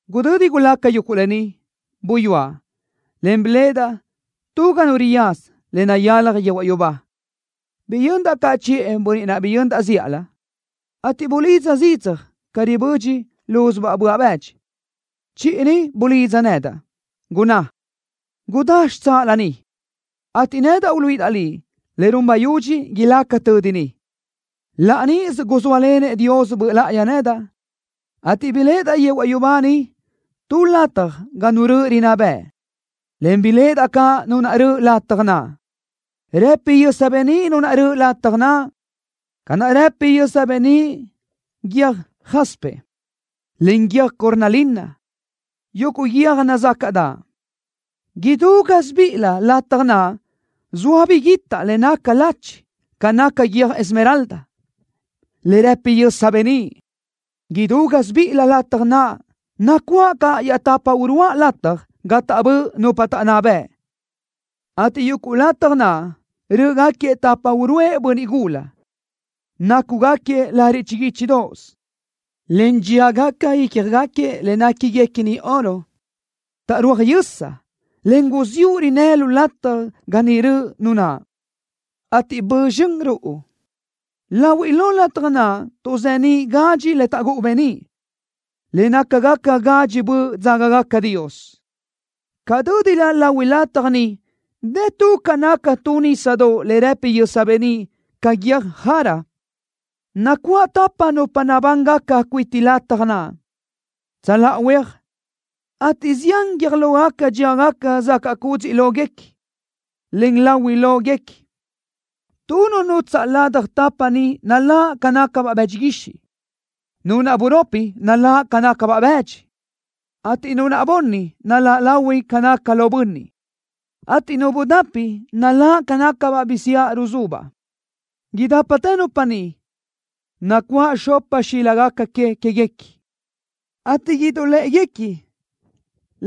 Gudödi gulaca yuguʼ lë ni, buyúaʼ, en biléʼedaʼ tu ga nu riyaza le nayalaj yehuaʼ yubá. Biyöndaʼ caʼ chiʼë bönniʼ naʼ biyöndaʼ zíʼalö, ateʼ bulidza zidzaj ca ribödxi lúzubaʼ böaʼ bëdxi. Chiʼi ni bulidza nedaʼ, gunná: “Gudá xitsáʼalö ni, ateʼ nedaʼ uluíʼidaʼ liʼ le run bayudxi ilaca tödi ni.” Laʼ níʼisö guzóalenëʼ Dios Böʼ Láʼayi nedaʼ, ateʼ biléʼedaʼ yehuaʼ yubá niʼ tu lataj ga Nu röʼö rinná bëʼ, en biléʼedaʼ caʼ Nu naʼ röʼö lataj naʼ. Rëpi yösa beníʼ Nu naʼ röʼö lataj naʼ, ca naʼ rëpi yösa beníʼ guiö́j jaspe, en guiö́j cornalina, yuguʼ guiö́j nazácaʼdaʼ. Idú gásibiʼilö lataj naʼ zoa biguitaʼ le naca lachi ca naca guiö́j esmeralda, le rë́pidaʼ yösa beníʼ. Idú gásibiʼilö lataj naʼ nacuáʼ caʼ iaʼtapa uruáʼ lataj gapa taʼbö́ʼ nupa taʼnná bëʼ, ateʼ yuguʼ lataj naʼ rö́ʼögaquiëʼ tapa uruʼë bönniʼ gula, nácugaquiëʼ lariʼ chiguíchidoʼos, en dxíagaca ícjagaquiëʼ le néquiguequini oro. Taʼrúaj yösa, en guziúʼ rinnë́ lu lataj lo ga niʼ röʼö Nu naʼ, ateʼ bö zxön ruʼu. Lahuiʼ lo lataj naʼ tuʼzeníʼ gadxi le taʼgúʼu beníʼ, le nácagaca gadxi böʼ dzágagaca Dios. Ca dö́dilö lahui lataj ni dë tu ca naca tu nísadoʼ le rëpi yösa beníʼ ca guiö́j jara. Nacuáʼ tapa nupa nabángaca cuiti lataj naʼ, tsöláʼa huéaj, ateʼ zián guiö́j lógaca dxíagaca zacaʼ cúdziʼlöguequi, en láhuilöguequi. Tu nu nutsaʼ ladaj tapa ni naláʼ ca nácabaʼ bëdxi guixiʼ. Nu naʼ buropi naláʼ ca nácabaʼ bëdxi, ateʼ nu naʼ bunni naláʼ lahui ca naca lo bönniʼ, ateʼ nu budapi naláʼ ca nácabaʼ bisiáʼ ruzubaʼ. Idápatë nupa ni, nacuáʼ xopa xíligaca que queëguequi, ateʼ idáʼalöguequi,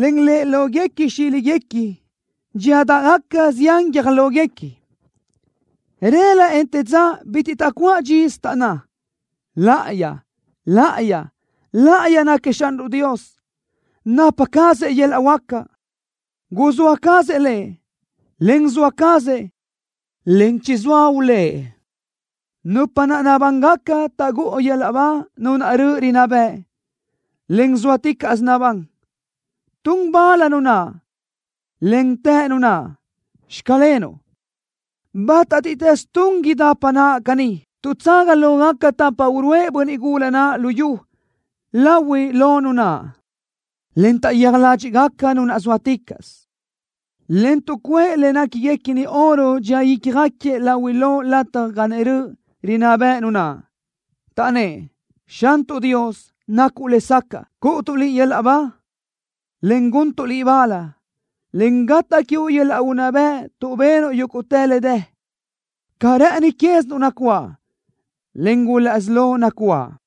en lë́ʼelöguequi xíliguequi dxíadaʼgaca zián guiö́j lóguequi. Rëla, en te ža bitiʼ taʼcuáʼ dxisö, taʼnná: ¡Láʼayi! ¡Láʼayi! ¡Láʼayi náquiëʼ Xanruʼ Dios! ¡Napa cazëʼ yöl-laʼ huáca! ¡Guzóa cazëʼ Lëʼ, en zoa cazëʼ, en chizóa ulë́ʼ! Nupa naʼ nabángaca taʼgúʼu yöl-laʼ ba Nu naʼ röʼö rinná bëʼ, en zóaticaʼsö nabán. Tun bal Nu naʼ, en të Nu naʼ: “Xclenuʼ.” Bátatiʼtës tun idapa naʼ caní, tuʼtsaga lógaca tapa uruʼë bönniʼ gula naʼ lu yu lahuiʼ lo Nu naʼ, en taʼyéaj ládxiʼgaca Nu naʼ zóaticaʼsö, en tuʼcuʼë le néquiguequini oro dxía ícjagaquiëʼ lahuiʼ lo lataj ga niʼ röʼö rinná bëʼ Nu naʼ, taʼnnë́ʼ: ¡Xantuʼ Dios, nacuʼ lesacaʼ cúʼutuʼ Liʼ yöl-laʼ ba, en guntuʼ Liʼ bal, en gataʼ quiuʼ yöl-laʼ unná bëʼ tuʼ benuʼ yúguʼtë le dë! ¡Ca rë́ʼëni quézinuʼ nacuáʼ, en gulaʼsí lo nacuáʼ!